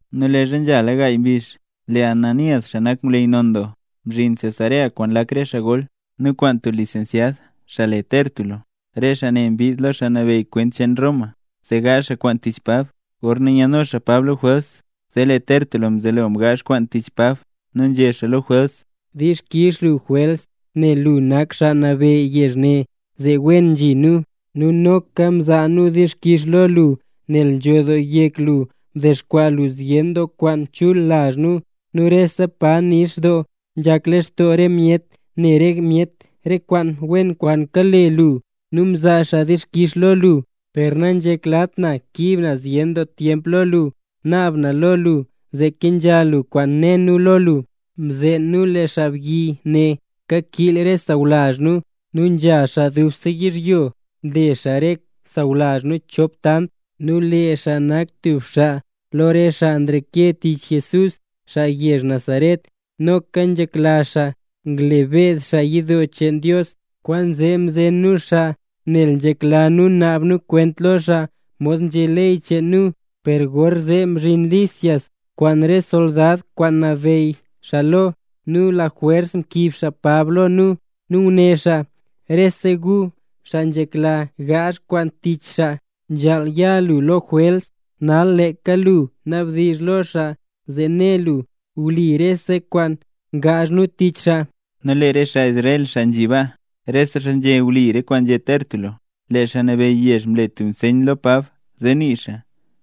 Nu leezha nzhala gaay mbizh, lee Ananías, xaa nak ngwleyy non doo, mzhin Cesarea kwaan lak re xaa gol, nu kwaan tub lisensyad xaa le Tértulo. Re xaa ne mbid lo xaa nabeyy kwent cheen Roma, zee gaazh xaa kwaan tich Pab. Gorna nyaadno xaa Pab lo Jwels, zee lee Tértulo mzelo mgaazh kwaan tich Pab nu nzhé xaa lo Jwels: —Dixkix lu, Jwels. Nel lu nak xaa nabeyy yezh ne zee wen nzhi nu. Nu noka nzaa nu dixkix lo lu nel nzho doo yek lu mdexkwaa lu zyen doo kwaan chul lazh nu. Nu rese pa nix doo nzhak lextoo re myet ne re myet re kwaan wen kwaan kale lu nu nzaa xaa dixkix lo lu. Per nanzheklat na kiib na zyen doo tyemp lo lu, naab na lo lu zee kenzha lu kwaan né nu lo lu. Mzeen nu lee xaabyi ne kakiil re sawlazh nu, nu nzha xaa dubse yizhyo nle xaa re sawlazh nu chop tant; nu lee xaa nak tub xaa lo re xaa nreke tich Jesús, xaa yezh Nazaret. Noka nzhekla xaa ngle beed xaa yidoo cheen Dios; kwaanzee mzen nu xaa nel nzhekla nu naab nu kwent lo xaa mod nzhé ley cheen nu. Per gorzee mzhin Lisias kwaan re soldad kwaan nabeyy xaa lo, nu lajwers mkiib xaa Pab lo nu, nu nguné xaa: “Rese gu, xaa nzhekla gaazh kwaan tich xaa nzhaal ya lo Jwels”. Nal leeka lu nabdizh lo xaa zee ne lu wli rese kwaan ngaazh nu tich xaa. Nu lee re xaa Israel, xaa nzhi baa, rese xaa nzhé wli re kwaan nzhé Tértulo. Lee xaa nabeyy yezh mle tub nseyn lo Pab zee nii xaa,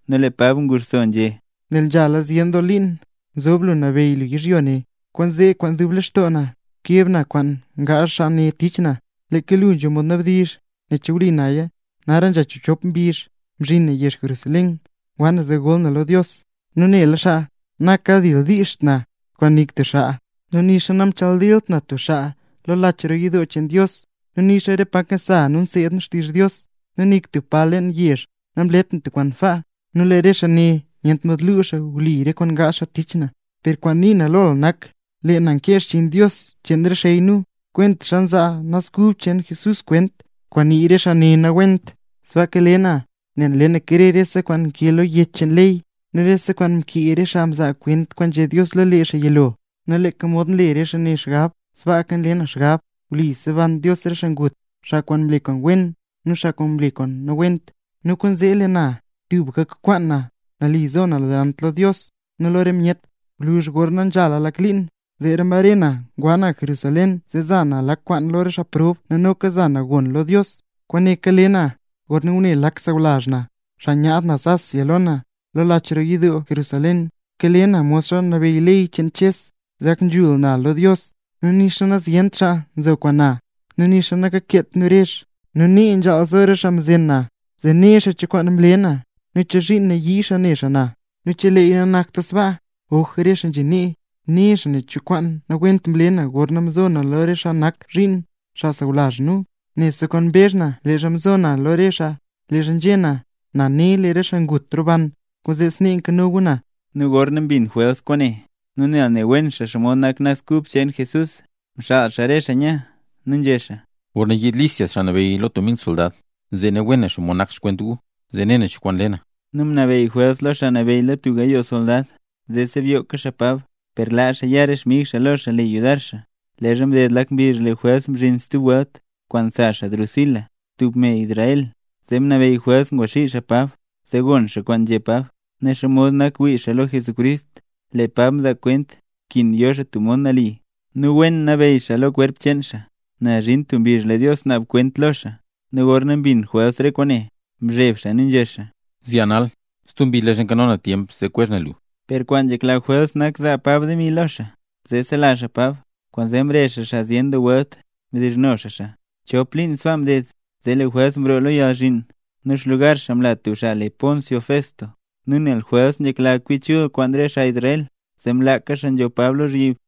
nu lee Pab nguxso nu nzhé: —Nel nzhala zyen doo liin nzob lu nabeyy yizhyo ne, kwaanzee kwaan dub lextoo na keb na re kwaan gaazh xaa ne tich na. Leeka lu nzho mod nabdizh nen che wli naya, nara nzha chiibchop mbizh mzhin na yezh Jerusalén, ngwa na zee gol na lo Dios. Nu nela xaa nakadildiizht na kwaan nik tub xaa, nu nixa namchadilt na tub xaa lo lach roo yidoo cheen Dios, nu nixa re pa nkasa nu nseed nu xtizh Dios, nu nik tub pa leen yezh namlet na tub kwaan sbaa. Nu lee re xaa ne nyent mod lu xaa wli re kwaan ngaazh xaa tich na. Per kwaan nii na lo lu nak; lee na nkee xchiin Dios cheen re xey nu, kwentaxa nzaa Naz Kub cheen Jesús kwent, kwaan nii re xaa ne nawent. Sbaaka kale na nel nle na krer rese kwaan nkee lo yech cheen ley nu re kwaan mkee re xaa mzaa kwent kwaan nzhé Dios lo lee xaa yilo. Nu leeka mod nle re xaa ne xgab, sbaaka nle na xgab; wli seban Dios re xaa ngut, xaa kwaan mle kwaan wen nu xaa mle kwaan nawent. Nu kwaanzee lee na tubka nkwaan na nali zo na delant lo Dios nu lo re myet. ’Gwluzh gorna nzhala lak liin, zeera mbare na ngwa na Jerusalén zee za na lak kwaan lo re xaa prob nu noka nzhaza na gon lo Dios. Kwaane kale na gorna ngune lak xaa sawlazh na, xaa nyaad naz Asia lo na, lach roo yidoo Jerusalén. Kale na modxa nabeyy ley cheen Ches zee gak nzhul na lo Dios. Nu nixa nazyent xaa nzo kwaan na, nu nixa nakakeet nu rezh. Nu nee nzhaal zo re xaa mzen na zee ne xaa cho kwaan mle na nu chozhiin nayii xaa ne xaa na. Nu cheleeya nanakta sbaa, oj re xaa nzhi nee, né xaa nen cho kwaan nawent mle na gorna mzo na lo re xaa nak zhiin, xaa sawlazh nu. Nebse kwaan mbezh na leezha mzo na lo re xaa leezha nzhé na: “Na né, lee re xaa ngut roban, kwaanzee snee nkano gu na”. Nu gorna mbin Jwels kwaane, nu nel ne wen xaa xomod nak Naz Kub cheen Jesús, mxaal xaa re xaa nya, nu nzhé xaa: —Gorna yiid Lisias xaa nabeyy lo tub mil soldad, zee ne wen na xomod nak xkwent gu, zee ne na cho kwaan le na. Nu mnabeyy Jwels lo xaa nabeyy lo tub gayoo soldad zee sebyoka xaa Pab, per laa xaa ya re xmig xaa lo xaa le yudar xaa. Leezha mded lak mbizh lee Jwels mzhin stub welt kwaan sa xaa Drusila, tub me Israel. Zee mnabeyy Jwels ngwaxii xaa Pab, zee gon xaa kwaan nzhé Pab, ne xomod nak wii xaa lo Jesucrist. Lee Pab mzaa kwent nkin yo xaa tub mod nali, nu wen nabeyy xaa kwerp cheen xaa, nel zhin tub mbizh lee Dios naab kwenta lo xaa. Nu gorna mbin Jwels re kwaane, mzheb xaa nu nzhé xaa: —Zyaa nal, stub mbizh leezha nkano na tyemp zee kwezh na lu. Per kwaan nzhekla Jwels nak zaa Pab demi lo xaa, zee sela xaa Pab; kwaanzee mrezh xaa xaa zyen doo welt, mdizhno xaa xaa. Chop liin sbaa mded, zee lee Jwels mroo lo yalzhiin, nu xlugar xaa mla tub xaa le Porcio Festo. Nu nel Jwels nzhekla kwi chul xaa kwaan re xaa Israel, zee mlaaka xaa nzho Pab lozhyib.